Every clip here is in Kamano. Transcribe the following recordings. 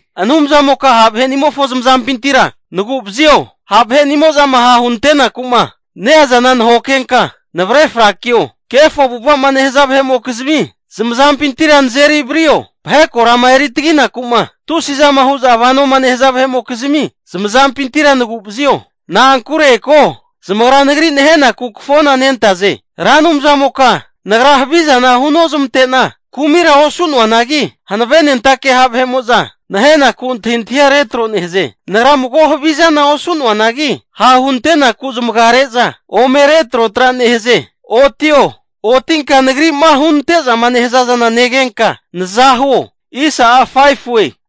Anumzamoka ha' vahe'nimofo zamazampintira nagu'vazio. Ha' vahe'nimo'zama ha' hunantenaku'ma neazana nahokenka navre frakio. Kefo avu'ava'ma nehaza vahe'mokizmi zamazampintira nazeri vario. Vahe korama eri taginaku'ma, tusi'zama hu'za vanoma nehaza vahe'mokizmi zamazampintira nagu'vazio. Hagi ko, zamagra nagri nahenaku kafona nentaze. Ra Anumzamoka nagra havizana hunozmante'na kumira osu'noanagi, hankavenentake ha' vahe'mo'za nahenaku antahintahia retro nehaze. Nagra mago havizana osu'noanagi, ha' hunante'naku zamaga re'za ome retrotra nehaze. Otio! Otinka nagri'ma hunante'zama nehaza zana negenka naza huo.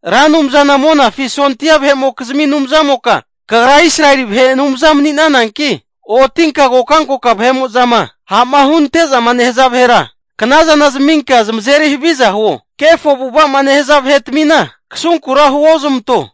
Ra Anumzana Monafi sondia vahe'mokizmi Anumzamoka, Kagra Israeli vahe Anumza mani'nananki, otinka kokankoka vahe'mo'zama ha'ma hunante'zama nehaza vahera knazana zaminka zamazeri haviza huo. Kefo avu'ava'ma nehaza vahe'tmina, kasunkura huozamanto.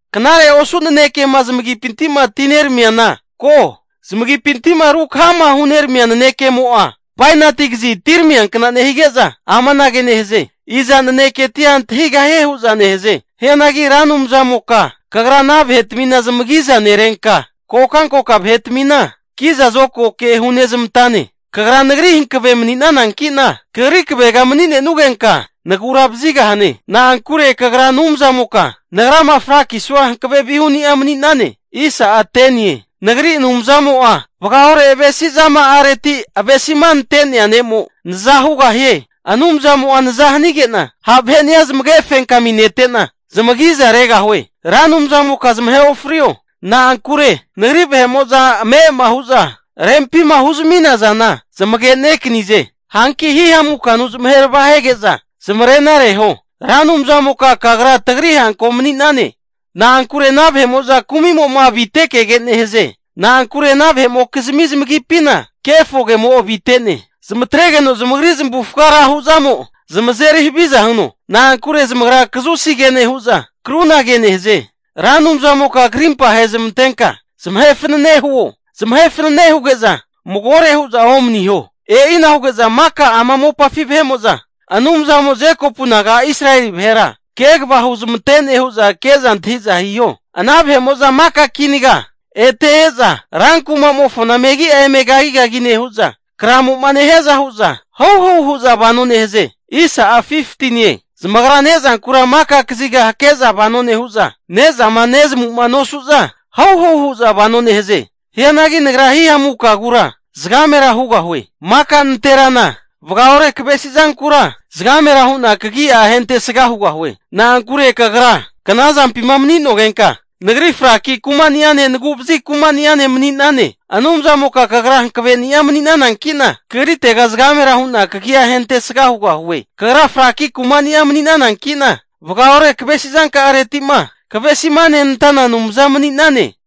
Knare osu nanekema zamagipinti'ma atineramiana ko. Zamagipinti'ma rukahama huneramia nanekemo'a, bainati kazi atiramiankna nehige'za amanage nehaze, Iza naneketia antahigahie hu'za nehaze. Hianagi Ra Anumzamoka Kagra ana vahetmina zamagiza nerenka, kokankoka vahetamina kiza zokago ke hunezmantane. Kagra nagri hankave mani'nananki'na, Kagri kavega mani'nenugenka, nagura vazigahane. Na'ankure Kagra Anumzamoka, nagrama frakisua hankave vihuni'a mani'nane. Nagri Anumzamo'a vagaore avesizama'areti avesima nenantea ne'mo naza hugahie. Anumzamo'a naza hanige'na, ha' vaheni'a zamage fenkaminete'na zamagiza regahue. Ra Anumzamoka zamahe ofrio. Na'ankure nagri vahe'mo'za ame'ama hu'za rempima huzmina zana zamagenekanize. Hanki hihamukanu zamahe arava hege'za zamarena reho. Ra Anumzamoka kagra tagri hanko mani'ne. Hagi ana vahe'mo'za kumi'mo avite kege nehaze. Na'ankure ana vahe'mokizmi zamagipina kefo kemo avite'ne. Zamatregeno zamagri zamavufaga ra hu'zamo, zamazeri haviza hino. Na'ankure zamagra kazusi ke nehu'za, krunage nehaze. Ra Anumzamoka karimpa ahe zamantenka zamahe fanane huo! Zamahe fanane huge'za magore hu'za omaniho. E'ina huge'za maka ama mopafi vahe'mo'za Anumzamo'a Jekopu naga Israeli vahera kegava huzmantene hu'za ke'za antahi'za hiho. Ana maka kinaga ete e'za rankumamofona megi'a eme kagigagi nehu'za, kramo'ma nehiaza hu'za, hauhau hu'za vano nehaze. Zamagra ne'zankura maka kaziga hake'za vano nehu'za, ne'zama nezamu'ma nosu'za hauhau hu'za vano nehaze. Hianagi nagra hihamukagura zagamera hugahue. Maka nanterana vagaore kavesizankura zagamera hu'na kagia ahentesga hugahue. Na'ankure Kagra knazampima mani'nogenka, nagrira fraki kuma'ene naguvazi kuma'ene mani'nane. Anumzamoka kagra hankavenia mani'nananki'na, Kagritega zagamera hu'na kagia ahentesga hugahue. Kagra fraki kumani'a mani'nanankinka, vagaore kavesizanka'aretima kavesima nenantana Anumza mani'nane.